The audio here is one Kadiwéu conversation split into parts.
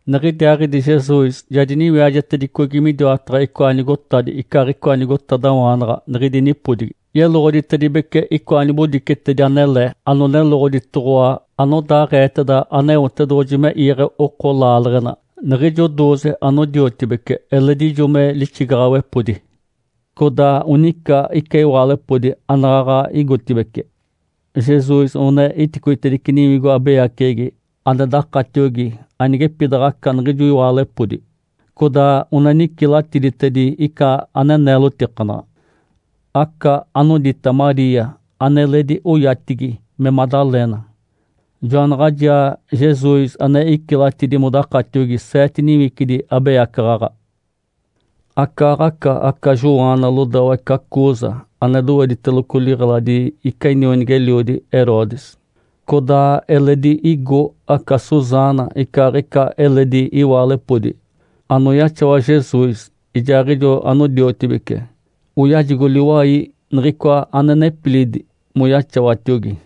Niɡ̶idiaaɡ̶idi Jesus ja diniwiajetedicogi midiwataɡ̶a icoa nigotadi icaaɡ̶icoa nigotadawaanaɡ̶a niɡ̶idi nipodigi, yeloɡ̶oditedibece icoa nibodicetedi anele, anoneloɡ̶oditoɡ̶owa anodaaɡ̶eeteda Aneotedoɡ̶oji me iiɡ̶e oko laaleɡ̶ena. Niɡ̶ijo dooze anodiotibece eledi ijo me lixigaɡ̶awepodi. Codaa onica ica iwaalepodi anaɡ̶aɡ̶a igotibeci. Jesus one iticoitedice niwigo abeyaceɡ̶egi ane dakatiogi anigepidaɡ̶aca niɡ̶ijo iwaalepodi, codaa one nicilatidi ica ane neelotikanaɡ̶a. Aca anodita Maria aneledi oyatigi me Madalena. Joanaɡ̶ajaa Jesus ane icilatidi modakatiogi seete niwicidi abeyacaɡ̶aɡ̶a. Acaaɡ̶aca aca Joana lodawa ica Cuza ane dowediteloco liɡ̶eladi ica inionigi-eliodi Herodes. Codaa eledi igo aca Susana, icaaɡ̶ica eledi iwaalepodi, anoyaxawa Jesus ijaaɡ̶ijo anodiotibece, oyajigo liwai niɡ̶icoa ane nepilidi moyaxawatiogi.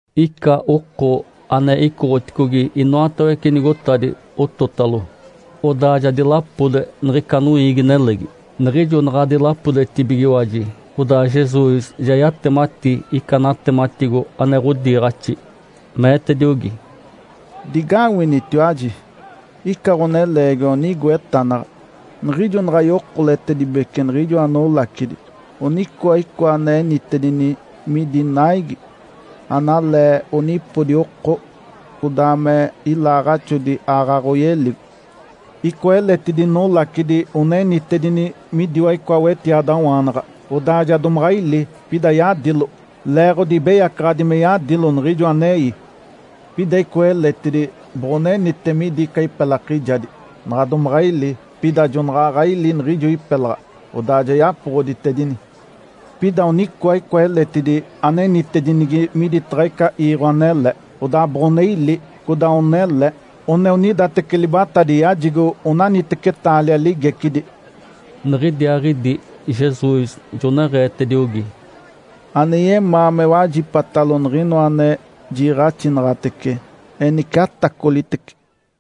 Ica oko ane icoɡ̶oticogi inoatawece nigotadi ototalo, odaa ja dilapode niɡ̶ica noiigi-nelegi. Niɡ̶ijo naɡ̶a dilapodetibigiwaji, odaa Jesus ja yatemati ica natematigo ane ɡ̶odiiɡ̶axi, meetediogi, “Digawinitiwaji! Ica ɡ̶oneleegiwa onigo etanaɡ̶a. Niɡ̶ijo naɡ̶a yokoletedibece niɡ̶ijoa nolacidi, onicoa icoa ane enitedini midi naigi. Analee onipodi oko, codaa me ilaaɡ̶axodi aaɡ̶aɡ̶a oyeligo. Icoa eletidi nolacidi one enitedini midiwa icoa wetiadawaanaɡ̶a. Odaa ja domaɡ̶a ili, pida yadilo, leeɡ̶odi ibeyacaɡ̶adi me yadilo niɡ̶ijo anei. Pida icoa eletidi boɡ̶onenite midi ica ipelakijadi. Naɡ̶a domaɡ̶a ili, pida jonaɡ̶aɡ̶a ili niɡ̶ijo ipelaɡ̶a, odaa ja yapoɡ̶oditedini. Pida onicoa icoa eletidi anenitedinigi miditaɡ̶a ica iiɡ̶o anele. Odaa boɡ̶one ili, codaa onele. One onidateci libatadi yajigo onaniteci taalia ligecidi.” Niɡ̶idiaaɡ̶idi Jesus joneɡ̶eetediogi, “Ane yemaa me wajipatalo niɡ̶inoa ane jiiɡ̶axinaɡ̶atece, enice atacolitece!”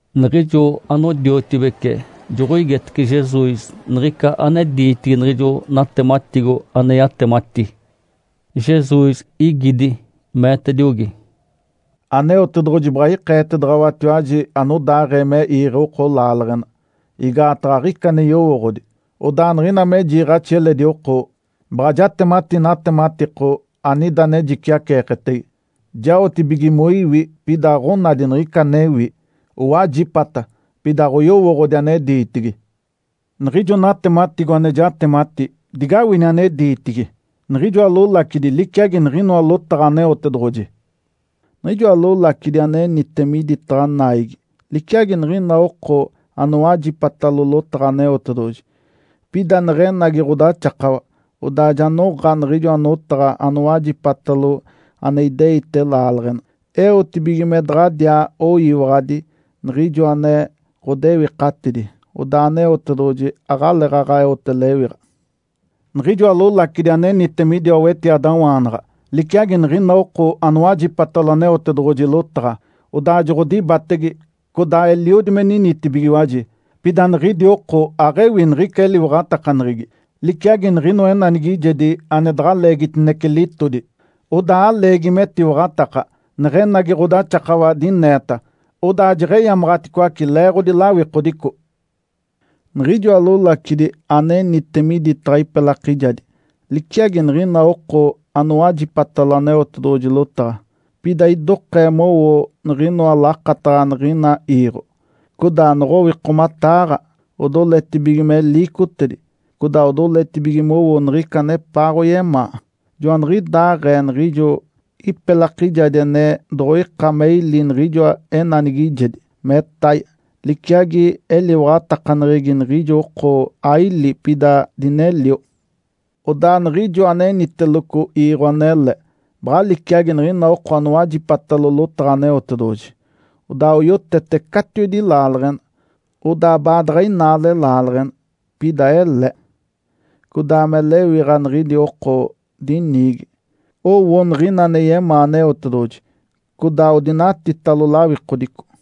Niɡ̶ijo anodiotibece joɡ̶oigetece Jesus niɡ̶ica ane diitigi niɡ̶ijo natematigo ane yatemati. Jesus igidi, meetediogi, “Aneotedoɡ̶oji baɡ̶a ikeetedaɡ̶awatiwaji anodaaɡ̶ee me iiɡ̶e oko laaleɡ̶ena, igaataɡ̶a aɡ̶ica ane yowooɡ̶odi. Odaa niɡ̶ina me jiiɡ̶axi eledi oko, baɡ̶a jatemati natematiko anida ane jiciaceeketege. Jaotibige moiwi pida aɡ̶onadi niɡ̶ica anewi, owajipata pida aɡ̶oyowooɡ̶odi ane diitigi. Niɡ̶ijo natematigo ane jatemati, digawini ane diitigi. Niɡ̶ijoa lolacidi liciagi niɡ̶inoa lotaɡ̶a Aneotedoɡ̶oji. Niɡ̶ijoa lolacidi anenite miditaɡ̶a naigi, liciagi niɡ̶ina oko anowajipatalo lotaɡ̶a Aneotedoɡ̶oji. Pida neɡ̶enagi ɡ̶odaxakawa, odaa ja noɡ̶a niɡ̶ijoa notaɡ̶a anowajipatalo ane ideite laaleɡ̶ena. Eotibige me daɡ̶adiaa oyiwaɡ̶adi Niɡ̶ijoa ane ɡ̶odewikatidi, odaa Aneotedoɡ̶oji aɡ̶aleeɡ̶aɡ̶a eote lewiɡ̶a. Niɡ̶ijoa lolacidi anenite midiwa wetiadawaanaɡ̶a, liciagi niɡ̶ina oko anowajipatalo Aneotedoɡ̶oji lotaɡ̶a, odaa joɡ̶odibatege codaa eliodi me ninitibigiwaji. Pida niɡ̶idi oko aɡ̶ewi niɡ̶ica eliwaɡ̶atakaneɡ̶egi. Liciagi niɡ̶inoa enanigijedi ane daɡ̶a leegitinece litodi. Odaa aleegi metiwaɡ̶ataka, neɡ̶enagi ɡ̶odaxakawa dineeta, odaa jeɡ̶eyamaɡ̶aticoace leeɡ̶odi lawikodico. Niɡ̶ijoa lolacidi anenite miditaɡ̶a ipelakijadi, liciagi niɡ̶ina oko anowajipatalo Aneotedoɡ̶oji lotaɡ̶a, pida idokee mowo niɡ̶inoa lakataɡ̶a niɡ̶ina iiɡ̶o, codaa noɡ̶owikomataaɡ̶a, odoletibige me liicotedi, codaa odoletibige mowo niɡ̶ica anepaaɡ̶oyemaa. Joaniɡ̶idaaɡ̶ee niɡ̶ijo ipelakijadi ane doɡ̶oika me ili niɡ̶ijoa enanigijedi, metaye, liciagi eliwaɡ̶atakaneɡ̶egi niɡ̶ijo oko aili pida dinelio. Odaa niɡ̶ijoa aneniteloco iiɡ̶o anele baɡ̶a liciagi niɡ̶ina oko anowajipatalo lotaɡ̶a Aneotedoɡ̶oji, odaa oyotete catiwedi laaleɡ̶ena. Odaa baadaɡ̶a inaale laaleɡ̶ena, pida ele. Codaa me lewiɡ̶a niɡ̶idi oko diniigi, owo niɡ̶ina ane yemaa Aneotedoɡ̶oji codaa odinatitalo lawikodico.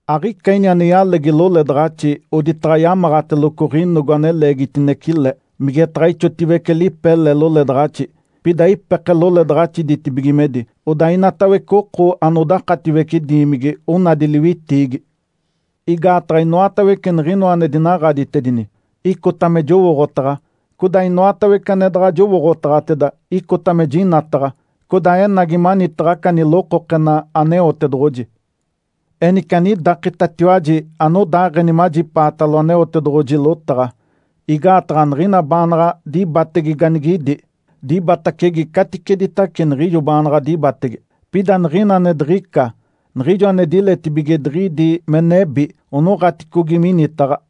Aɡ̶ica ini ane yalegi loledaɡ̶axi oditaɡ̶a yamaɡ̶ateloco ɡ̶inogo ane leegitinece le, migetaɡ̶a ixotiwece lipe le loledaɡ̶axi, pida ipeke loledaɡ̶axi ditibigimedi, odaa inatawece oko anodakatiwece diimigi onadi liwitiigi. Igaataɡ̶a inoatawece niɡ̶inoa ane dinaɡ̶aditedini, icota me jowooɡ̶otaɡ̶a, codaa inoatawece ane daɡ̶a jowooɡ̶otaɡ̶ateda, icota me jinataɡ̶a, codaa enagi manitaɡ̶a aca nilokokena Aneotedoɡ̶oji. Enice anidakitatiwaji anodaaɡ̶eni majipaatalo Aneotedoɡ̶oji lotaɡ̶a. Igaataɡ̶a niɡ̶ina baanaɡ̶a dibatege ganigidi, dibatacege caticeditace niɡ̶ijo baanaɡ̶a dibatege. Pida niɡ̶ina ane diɡ̶ica, niɡ̶ijo ane diletibige diɡ̶idi me nebi, onoɡ̶aticogi minitaɡ̶a.”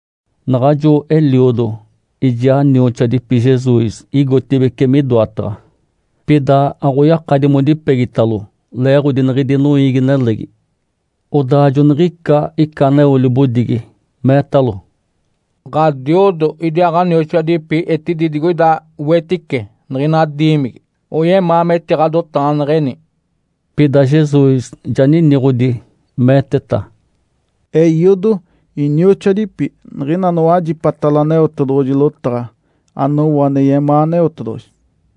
Naɡ̶ajo eliodo ijaa nioxoadipi Jesus igotibeci midoataɡ̶a. Pida aɡ̶oyakadi modipegitalo, leeɡ̶odi niɡ̶idi noiigi-nelegi. Odaa joniɡ̶ica ica aneo libodigi, meetalo, “Ǥadiodo, idiaa ɡ̶anioxoadipi etidi digoida wetice niɡ̶ina diimigi. Oyemaa metiɡ̶adotaɡ̶aneɡ̶eni.” Pida Jesus ja niniɡ̶odi, meeteta, “Eiodo, inioxoadipi, niɡ̶ina anowajipatalo Aneotedoɡ̶oji lotaɡ̶a, anowo ane yemaa Aneotedoɡ̶oji.”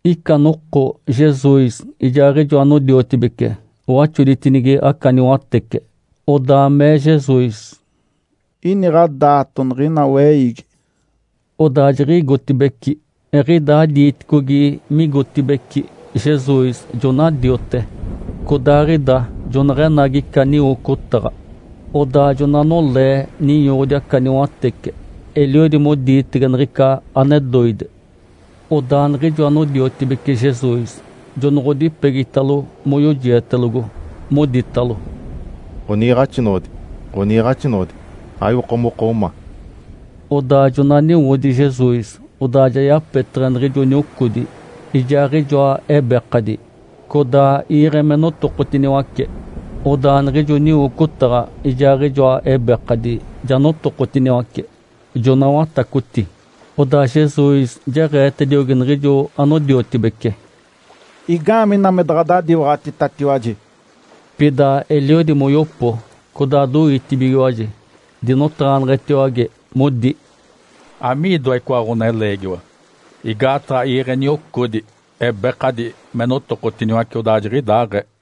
Ica noko Jesus ijaaɡ̶ijo anodiotibece owaxoditinigi aca niwatece, odaa mee Jesus, “Iniɡ̶a daato niɡ̶ina weiigi.” Odaa jiɡ̶igotibeci. Eɡ̶idaa diiticogi migotibeci, Jesus jona diote. Codaaɡ̶ida joneɡ̶enagi ica niwocotaɡ̶a, odaa jona nolee ninyoɡ̶odi aca niwatece. Eliodi modiitege niɡ̶ica ane doide. Odaa niɡ̶ijo anodiotibece Jesus jonoɡ̶odipegitalo moyojietelogo, moditalo, “Ǥoniiɡ̶axinoɡ̶odi! Ǥoniiɡ̶axinoɡ̶odi! Aiwoko moko ma!” Odaa jona niwodi Jesus. Odaa ja yapeteɡ̶e niɡ̶ijo niocodi, ijaaɡ̶ijoa ebekadi, codaa iiɡ̶e me notokotiniwace. Odaa niɡ̶ijo niwocotaɡ̶a, ijaaɡ̶ijoa ebekadi ja notokotiniwace, jona watacoti. Odaa Jesus jeɡ̶eetediogi niɡ̶ijo anodiotibece, “Igaamee ina me daɡ̶adadiwaɡ̶atitatiwaji?” Pida eliodi moyopo, codaa doitibigiwaji, dinotaɡ̶aneɡ̶etiwage modi, “Amiidoa icoa ɡ̶oneleegiwa? Igaataɡ̶a iiɡ̶e niocodi, ebekadi me notokotiniwace, odaa jiɡ̶idaaɡ̶ee!”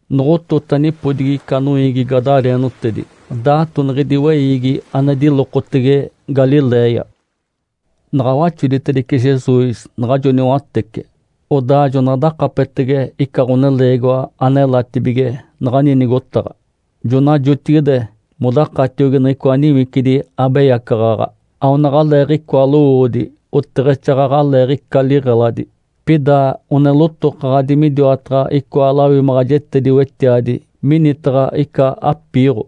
Noɡ̶otota nipodigi ica noiigi gadareenotedi, daato niɡ̶idi weiigi ane dilokotege Galiléia. Naɡ̶a waxoditedice Jesus naɡ̶ajo niwatece, odaa jona dakapetege ica ɡ̶oneleegiwa anelatibige naɡ̶ani nigotaɡ̶a. Jona jotigide modakatiogi niɡ̶icoa niwicidi abeyacaɡ̶aɡ̶a. Aonaɡ̶aleeɡ̶icoa lowoodi, oteɡ̶exaaɡ̶aɡ̶aleeɡ̶ica liɡ̶eladi, pida one lotokaɡ̶adi midiwataɡ̶a icoa lawimaɡ̶ajetedi-wetiadi minitaɡ̶a ica apiiɡ̶o.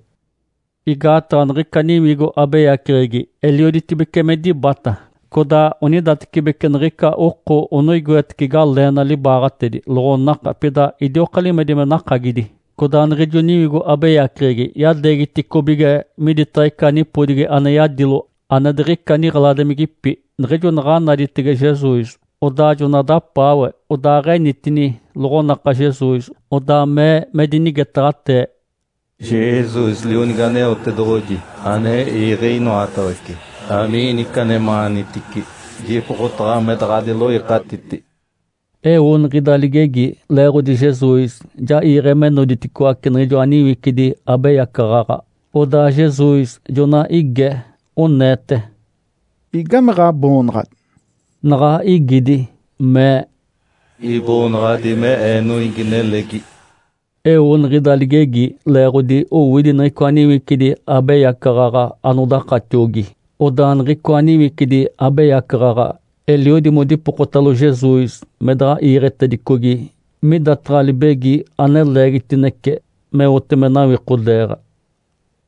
Igaataɡ̶a niɡ̶ica niwigo abeyaceɡ̶egi elioditibece me dibata. Codaa onidatecibeci niɡ̶ica oko one oigoetece galeena libaaɡ̶atedi, loɡ̶onaka, pida idioka limedi me nakagidi. Codaa niɡ̶ijo niwigo abeyaceɡ̶egi yadeegiticobige miditaɡ̶a ica nipodigi ane yadilo ane diɡ̶ica niɡ̶eladimigipi. Niɡ̶ijo naɡ̶a naditege Jesus, odaa jona dapaawe, odaaɡ̶enitini loɡ̶onaka Jesus, odaa mee me dinigetaɡ̶atee, “Jesus, Lionigi Aneotedoɡ̶oji ane iiɡ̶e inoatawece! Amiina ica anemaanitici? Jipokotaɡ̶awa me daɡ̶adiloikatiti.” Eo niɡ̶ida ligegi, leeɡ̶odi Jesus ja iiɡ̶e me noditicoaci niɡ̶ijoa niwicidi abeyacaɡ̶aɡ̶a. Odaa Jesus jona ige, oneete, “Igame ɡ̶aboonaɡ̶adi?” Naɡ̶a igidi, mee, “Iboonaɡ̶adi me ee, ‘Noiigi-nelegi’.” Eo niɡ̶ida ligegi leeɡ̶odi owidi niɡ̶icoa niwicidi abeyacaɡ̶aɡ̶a anodakatiogi. Odaa niɡ̶icoa niwicidi abeyacaɡ̶aɡ̶a eliodi modipokotalo Jesus me daɡ̶a iiɡ̶etedicogi midataɡ̶a libegi ane leegitinece, meote me nawikodeeɡ̶a.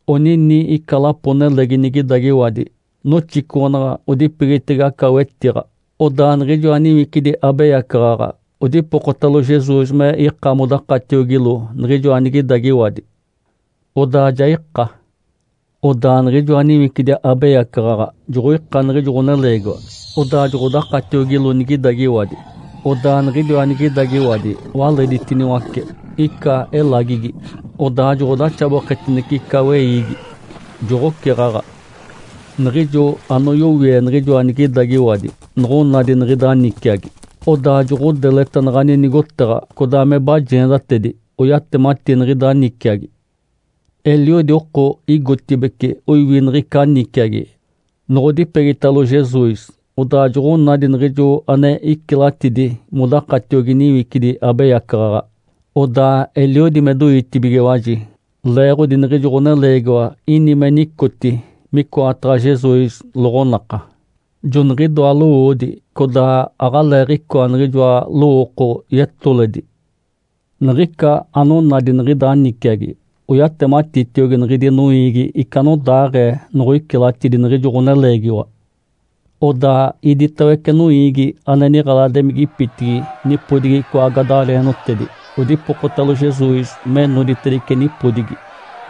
Onini ica lapo-nelegi nigidagiwadi noxicoɡ̶onaɡ̶a odipegitege aca wetiɡ̶a. Odaa niɡ̶ijoa niwicidi abeyacaɡ̶aɡ̶a odipokotalo Jesus me ika modakatiogilo niɡ̶ijoa nigidagiwadi. Odaa ja ika. Odaa niɡ̶ijoa niwicidi abeyacaɡ̶aɡ̶a joɡ̶oika niɡ̶ijo ɡ̶oneleegiwa, odaa joɡ̶odakatiogilo nigidagiwadi. Odaa niɡ̶idiwa nigidagiwadi waleditiniwace ica elagigi, odaa joɡ̶odaxaboketinece ica weiigi, joɡ̶oceɡ̶aɡ̶a. Niɡ̶ijo anoyowie niɡ̶ijoa nigidagiwadi noɡ̶onadi niɡ̶ida niciagi, odaa joɡ̶odeleta naɡ̶ani nigotaɡ̶a, codaa me bajeendatedi, oyatemati niɡ̶ida niciagi. Eliodi oko igotibeci oiwi niɡ̶ica niciagi. Noɡ̶odipegitalo Jesus, odaa joɡ̶onadi niɡ̶ijo ane icilatidi modakatiogi niwicidi abeyacaɡ̶aɡ̶a, odaa eliodi me doitibigiwaji, leeɡ̶odi niɡ̶ijo ɡ̶oneleegiwa ini me nicoti micoataɡ̶a Jesus loɡ̶onaka, joniɡ̶idoa lowoodi, codaa aɡ̶aleeɡ̶icoa niɡ̶ijoa lowooko yetoledi. Niɡ̶ica anonadi niɡ̶ida niciagi, oyatematitiogi niɡ̶idi noiigi ica anodaaɡ̶ee noɡ̶oicilatidi niɡ̶ijo ɡ̶oneleegiwa. Odaa iditawece noiigi ane niɡ̶eladimigipitigi nipodigi icoa gadareenotedi odipokotalo Jesus me noditedice nipodigi,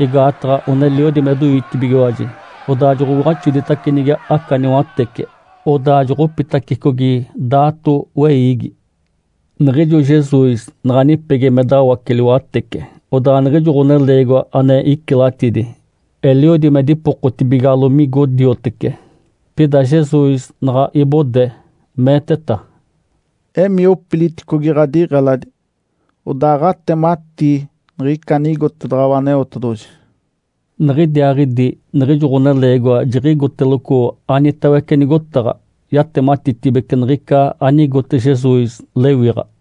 igaataɡ̶a one eliodi me doitibigiwaji. Odaa jonoɡ̶owaxoditacinigi aca niwatece, odaa joɡ̶opitacicogi daato weiigi. Niɡ̶ijo Jesus naɡ̶a nipegi me dawace liwatece, odaa niɡ̶ijo ɡ̶oneleegiwa ane icilatidi eliodi me dipokotibigalo migo diotece. Pida Jesus naɡ̶a ibode, meeteta, “Emii opiliticogi ɡ̶adiɡ̶eladi, odaaɡ̶atematii niɡ̶ica anigotedaɡ̶awa Aneotedoɡ̶oji.” Niɡ̶idiaaɡ̶idi niɡ̶ijo ɡ̶oneleegiwa jiɡ̶igoteloco anitawece nigotaɡ̶a, yatematitibece niɡ̶ica anigote Jesus lewiɡ̶a.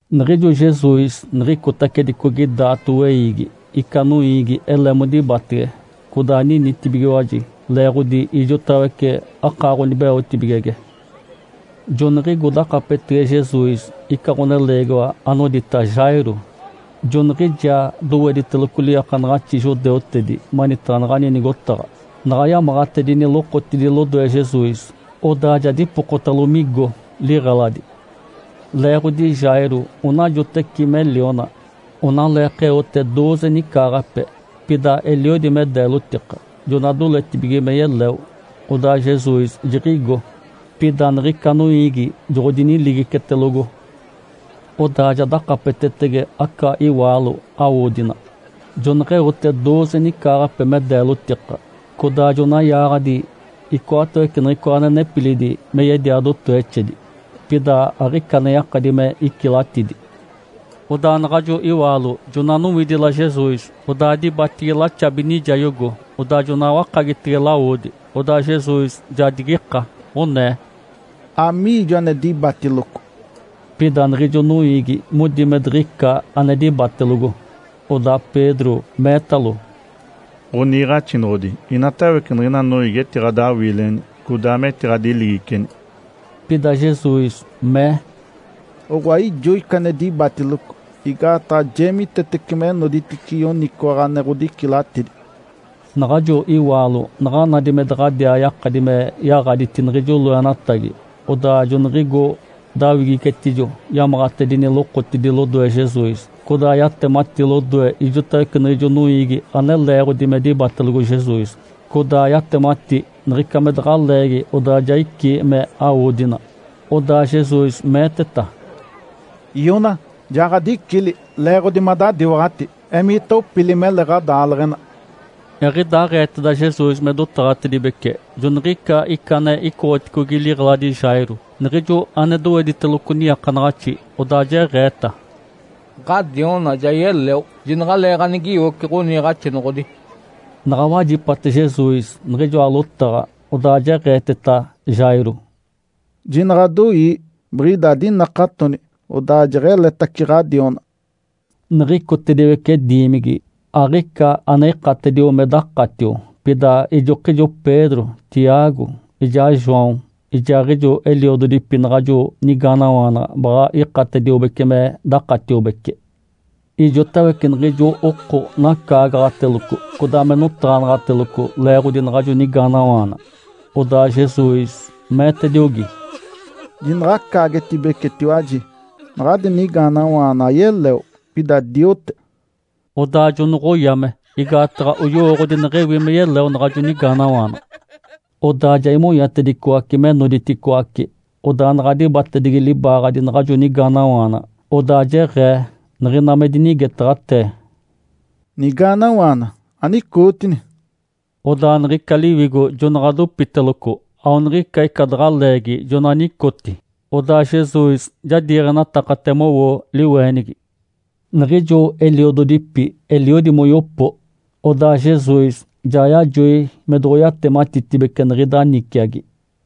Niɡ̶ijo Jesus niɡ̶icotacedicogi daato weiigi, ica noiigi ele modibatege, codaa ninitibigiwaji leeɡ̶odi ijotawece akaaɡ̶onibeotibigege. Joniɡ̶igo dakapetege Jesus ica ɡ̶oneleegiwa anodita Jairo. Joniɡ̶ijaa dowediteloco liiakanaɡ̶axi judeutedi manitaɡ̶a naɡ̶ani nigotaɡ̶a. Naɡ̶a yamaɡ̶atedini lokotidi lodoe Jesus, odaa ja dipokotalo migo liɡ̶eladi. Leeɡ̶odi Jairo onajoteci me liona, onaleekeote dooze nicaaɡ̶ape, pida eliodi me deelotika, jona doletibige me yeleo. Odaa Jesus jiɡ̶igo, pida niɡ̶ica noiigi joɡ̶odiniligicetelogo. Odaa ja dakapetetege aca iwaalo awodina. Joneɡ̶eote dooze nicaaɡ̶ape me deelotika, codaa jona yaaɡ̶adi icoatawece niɡ̶icoa ane nepilidi me yedia dotowexedi. Pida aɡ̶ica ane yakadi me icilatidi. Odaa naɡ̶ajo iwaalo jona nowidila Jesus, odaa dibatigi laxabi nijayogo, odaa jona wakagitege lawodi. Odaa Jesus ja digika, onee, “Amiijo ane dibatiloco?” Pida niɡ̶ijo noiigi modi me diɡ̶ica ane dibatelogo. Odaa Pedro meetalo, “Ǥoniiɡ̶axinoɡ̶odi, inatawece niɡ̶ina noiigi etiɡ̶adawiileni, codaa metiɡ̶adiligiceni.” Pida Jesus mee, “Oɡ̶oa ijo ica ane dibatiloco, igaataɡ̶a jeemitetece me noditice yoniciwaɡ̶a ane ɡ̶odicilatidi.” Naɡ̶ajo iwaalo naɡ̶a nadi me daɡ̶adiaa yakadi me yaɡ̶aditi niɡ̶ijo loenatagi, odaa joniɡ̶igo dawigicetijo, yamaɡ̶atedini lokotidi lodoe Jesus. Codaa yatemati lodoe ijotawece niɡ̶ijo noiigi ane leeɡ̶odi me dibatelogo Jesus, codaa yatemati niɡ̶ica me daɡ̶a leegi odaa ja icí me awodina. Odaa Jesus meeteta, “Iona, ja ɡ̶adicili leeɡ̶odi madadiwaɡ̶ati. Emiita opili, mele ɡ̶adaaleɡ̶ena!” Eɡ̶idaaɡ̶eeteda Jesus me dotaɡ̶atedibece, joniɡ̶ica ica ane icoɡ̶oticogi liɡ̶eladi Jairo, niɡ̶ijo ane dowediteloco niiakanaɡ̶axi, odaa jeɡ̶eeta, “Ǥadiona ja yeleo. Jinaɡ̶aleeɡ̶anigiwoci Ǥoniiɡ̶axinoɡ̶odi.” Naɡ̶a wajipate Jesus niɡ̶ijoa lotaɡ̶a, odaa jeɡ̶eeteta Jairo, “Jinaɡ̶adoii! Biɡ̶ida adinakatoni, odaa jeɡ̶eletace ɡ̶adiona.” Niɡ̶icotediwece diimigi, aɡ̶ica ane ikatedio me dakatio, pida ijokijo Pedro, Tiago, ijaa João, ijaaɡ̶ijo eliododipi naɡ̶ajo nigaanawaana baɡ̶a ikatediobece me dakatiobece. Ijotawece niɡ̶ijo oko nacaagaɡ̶ateloco, codaa me notaɡ̶anaɡ̶ateloco leeɡ̶odi naɡ̶ajo nigaanawaana. Odaa Jesus meetediogi, “Jinaɡ̶acaagetibecetiwaji! Naɡ̶adi nigaanawaana ayeleo, pida diote.” Odaa jonoɡ̶oyame, igaataɡ̶a oyowooɡ̶odi neɡ̶ewi me yeleo naɡ̶ajo nigaanawaana. Odaa ja imonyatedicoace me noditicoaci, odaa naɡ̶a dibatedigi libaaɡ̶adi naɡ̶ajo nigaanawaana, odaa jeɡ̶ee niɡ̶ina me dinigetaɡ̶atee, “Nigaanawaana, anicootini!” Odaa niɡ̶ica liwigo jonaɡ̶a dopiteloco, aoniɡ̶ica ica daɡ̶a leegi jona nicoti. Odaa Jesus ja diiɡ̶enatakate mowo liweenigi. Niɡ̶ijo eliododipi eliodi moyopo. Odaa Jesus ja yajoi me doɡ̶oyatematitibece niɡ̶ida niciagi.